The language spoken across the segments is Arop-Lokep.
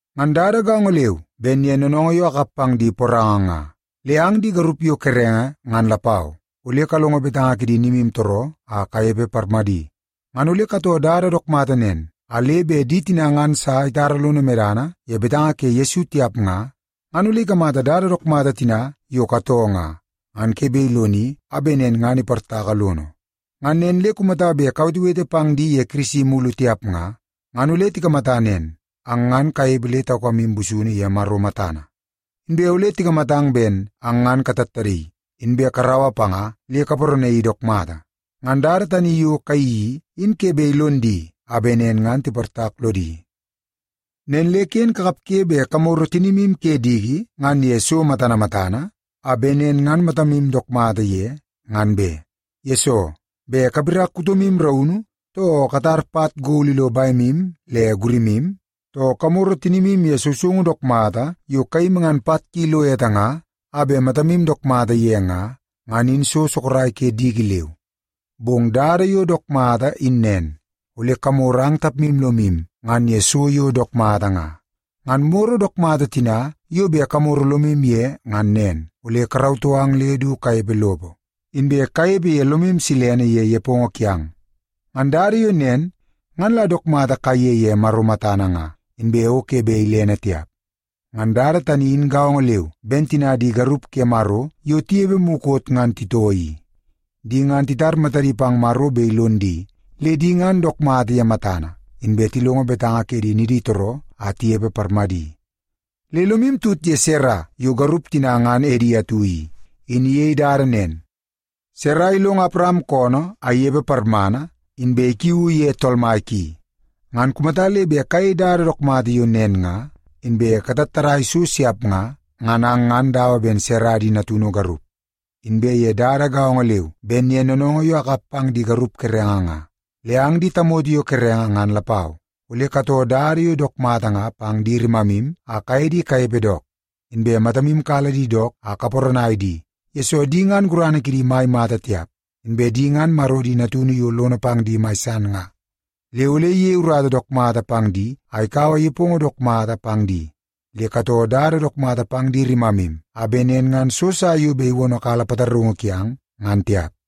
Ngan dada gaongo leu ben ye noonoongoo yo akap pang di poranga nga, le ang di garup yo kerenge ngan lapau, ole kalongo betanga kidi nimutooroo a kanepe parmadi. Ngan ole katoo dada dook mata nen, a le bet di tina ngan sa itara lono medana ye betanga ke Yesu tiap nga, ngan ole ikamata dada dook mata tina yo katoo nga, ngan ke bet iloni a bet nen ngan iportaka lono. Ngan nen le kumata bet kawetewete pang di ye Kirisi mulu tiap nga, ngan ole tikamata nen, ang ngan kanepe le taukamu busunu ye Maro matana. Inbe ole tikamatang ben ang ngan katattadaii, inbe karaua panga le kaparanaii dook mata. Ngan dada tani yo kayeii i, in ke bet ilon di a bet nen ngan tiportak lodi. Nen le ken kakapge bet kamoro tinimu ke diki ngan ye so matana matana a bet nen ngan matamu dook mata ye, ngan be. Yesoo, bet kapirak kutomu raunu, too katar pat gol ilo bemu le gurimu, too kamoro tinimu ye sousoungu dook mata yo kayimi ngan pat ki ilo ete nga, a bet matamu dook mata ye nga, ngan in so sorok ke diki leu. Bong dada yo dook mata in nen, ole kamoro ang tapmu lomu ngan ye so yo dook mata nga. Ngan moro dook mata tina yo bet kamoro lomu ye ngan nen, ole karautoo ang le du kanepe lopo, inbe kanepe ye lomu silene ye nepongo kiang. Ngan dada yo nen, ngan la dook mata kaiye ye Maro matana nga, inbe o ke bet ilene tiap. Ngan dada tani in gaongo leu ben tina di garup ke Maro yo tinepe mukot ngan titoo i. Di ngan titar matadi pang Maro bet ilon di, le di ngan dook mata ye matana, inbe tilongo betanga ke di niditooroo a tinepe parmadi. Le lomu tut ye Sara yo garup tina ngan edi atu i, in iyei dada nen. Sara ilongo Awaram koonoo a inepe parmana, inbe ikiuu ye tool mai ki. Ngan kumata le bet kayei dada dook mata yo nen nga, inbe katattadaia so siap nga, ngan ang ngan dawa ben Sara di natunu garup. Inbe ye dada gaongo leu ben ye noonoongoo yo akap pang di garup kerenge nga, le ang di tamoto yo kerenge ngan lapau, ole katoo dada yo dook mata nga pang di rimamu a kaye di kanepe dook. Inbe matamu kala di dook a kaparanai di, yesoo di ngan gurana kidi mai mata tiap. Inbe di ngan Maro di natunu yo lono pang di mai san nga. Le ole iyei urata dook mata pang di a ikaua nepongo dook mata pang di. Le katoo dada dook mata pang di rimamu a bet nen ngan so sa yo bet iwonokala pataraungu kiang, ngan tiap.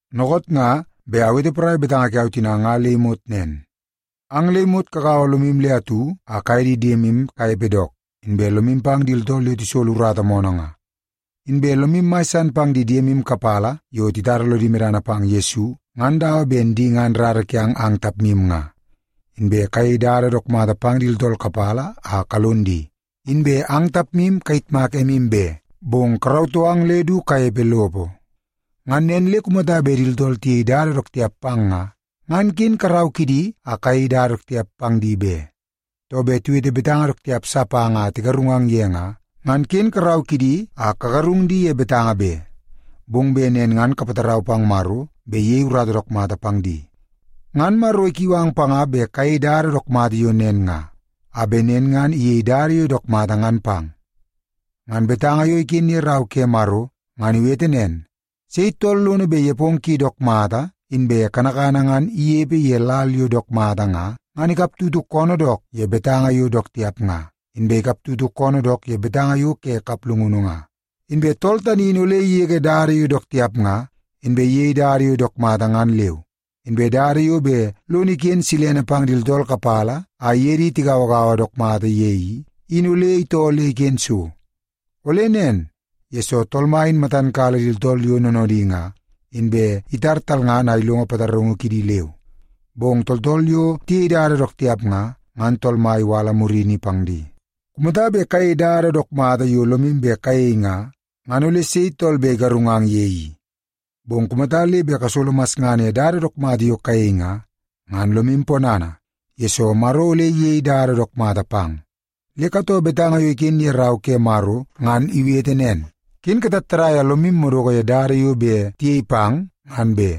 Dookoot nga bet awete porai betanga kiau tina nga le imot nen. Ang le imot kagaua lomu le atu a kaye di diemu kanepe dook, inbe lomu pang di tooltool yo tisolo urata moonoo nga. Inbe lomu mai san pang di diemu kapala yo titara lodi medana pang Yesu, ngan dawa ben di ngan rara kiang ang tapmu nga. Inbe kayei dada dook mata pang di tooltool kapala a kalon di, inbe ang tapmu kayitmak emu be, bong karautoo ang le du kanepe lopo. Ngan nen le kumata bet di tooltool tiyei dada dook tiap pang nga, ngan ken karau kidi a kayei dada dook tiap pang di be. Too, bet tiwete betanga dook tiap sa pang a tigarungang ye nga, ngan ken karau kidi a kagarung di ye betanga be. Bong bet nen ngan kapatarau pang Maro bet iyei urata dook mata pang di. Ngan Maro ikiu ang panga bet kayei dada dook mata yo nen nga, a bet nen ngan iyei dada yo dook mata ngan pang. Ngan betanga yo iken ye Rau ke Maro, ngan iwete nen, “Sei tool lono bet nepongo ki dook mata inbe kanakana ngan inepe ye lal yo dook mata nga, ngan ikaptutu koonoo dook ye betanga yo dook tiap nga, inbe ikaptutu koonoo dook ye betanga yo ke kaplungunu nga. Inbe tool tani in ole igege dada yo dook tiap nga, inbe iyei dada yo dook mata ngan leu. Inbe dada yo bet lono iken silene pang di tooltool kapala a iye di tigauagaua dook mata ye i, in ole itoo le iken so. Ole nen, yesoo Tool Mai in matan kala di tooltool yo noonoodi nga, inbe itar talngana a ilongo pataraungu kidi leu. Bong tooltool yo tiyei dada dook tiap nga, ngan Tool Mai iwala murini pang di.” Kumata bet kayei dada dook mata yo lomu bet kayei nga, ngan ole sei tool bet igarungang ye i? Bong kumata le bet kasolo masngana ye dada dook mata yo kayei nga, ngan lomu ponana, yesoo Maro ole iyei dada dook mata pang. Le katoo betanga yo iken ye Rau ke Maro ngan iwete nen, “Ken katattadai a lomu madoko ye dada yo bet tiyei pang ngan be.”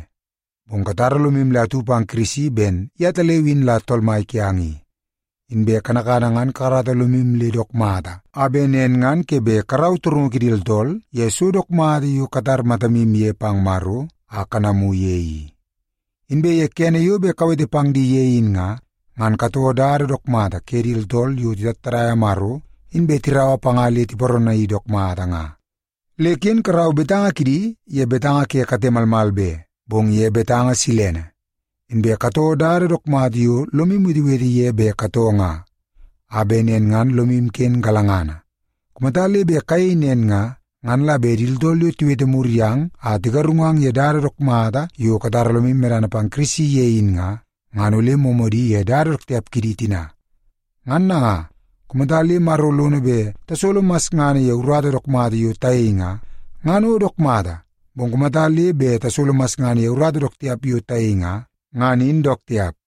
Bong katara lomu le atu pang Kirisi ben yetaleu in la Tool Mai kiang i. Inbe kanakana ngan kakarata lomu le dook mata a bet nen ngan ke bet karau torungu kidi tooltool ye so dook mata yo katar matamu ye pang Maro a kanamu ye i. Inbe ye kene yo bet kawete pang di ye in nga, ngan katoo dada dook mata ke di tooltool yo titattadaia Maro, inbe tiraua panga le tiparanaii dook mata nga. Le ken karau betanga kidi ye betanga ke kate malmal be, bong ye betanga silene. Inbe katoo dada dook mata yo lomu wetewete ye bet katoo nga, a bet nen ngan lomu ken galangana. Kumata le bet kayei nen nga, ngan la bet di tooltool yo tiwete mur yang a tigarungang ye dada dook mata yo katara lomu medana pang Kirisi ye in nga, ngan ole moomoodi ye dada dook tiap kidi tina. Ngan nanga, kumata le Maro lono bet tasolo masngana ye urata dook mata yo tayei nga, ngan o dook mata. Bong kumata le bet tasolo masngana ye urata dook tiap yo tayei nga, ngan in dook tiap.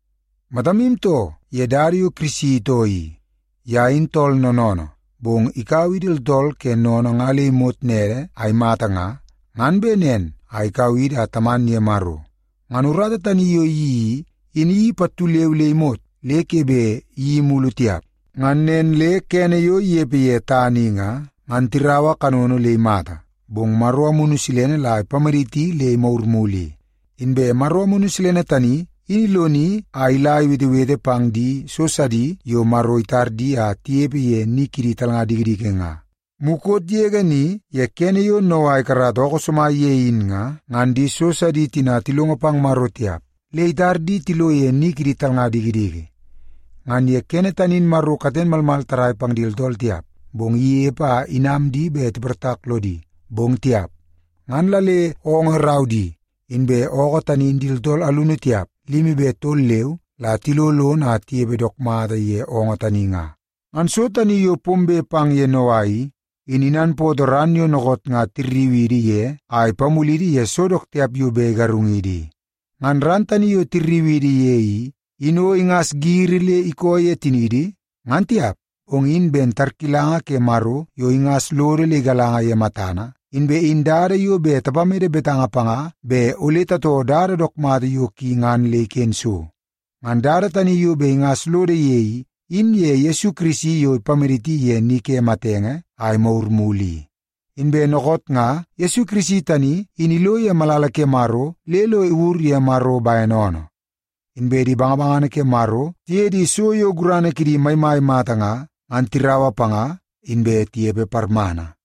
Matamu too ye dada yo Kirisi itoo i. Ye in tool noonoonoo, bong ikaua idi tooltool ke sennene nga le imot nede a imata nga, ngan bet nen a ikau idi a taman ye Maro. Ngan urata tani yo iyeii i, in iyeii pattu leu le imot, le ke bet iyeii mulu tiap. Ngan nen le kene yo inepe ye tana i nga, ngan tiraua kanono le imata, bong Maro Amunu Silene la ipamaditi le imagur mulu i. Inbe Maro Amunu Silene tani in iloni a ila iwetewete pang di so sidi yo Maro itar di a tinepe ye ni kidi talnga dikidiki nga. Mukot yege ni ye kene yo Noa ikarata ookoo somai ye in nga, ngan di so sidi tina tilongo pang Maro tiap, le itar di tilo ye ni kidi talnga dikidiki. Ngan ye kene tani in Maro katen malmal tarrai pang di tooltool tiap, bong inepe a inam di bet tiportak lodi, bong tiap. Ngan la le oongoo irau di, inbe ookoo tani in di tooltool alunu tiap, limi be tol leu, la tilo lono a tinepe dook mata ye oongoo tani nga. Ngan so tani yo pombe pang ye Noa i, in inanpootoo ran yo dookoot nga tirriu idi ye a ipamulidi ye so dook tiap yo bet igarungidi i. Ngan ran tani yo tirriu idi ye i, in o ingas giri le ikoo ye tiniidi, ngan tiap, bong in ben tarkilanga ke Maro yo ingas lodo le igalanga ye matana, inbe in dada yo bet tapamede betanga panga bet ole tatoo dada dook mata yo ki ngan le iken so. Ngan dada tani yo bet ingas lodo ye i, in ye Yesu Kirisi yo ipamaditi ye ni ke matenge a imagur mulu i. Inbe dookoot nga Yesu Kirisi tani in ilo ye malala ke Maro le lo iwur ye Maro bene oonoo. Inbe di bangabangana ke Maro tiye di so yo gurana kidi maimai mata nga, ngan tiraua panga, inbe tinepe parmana.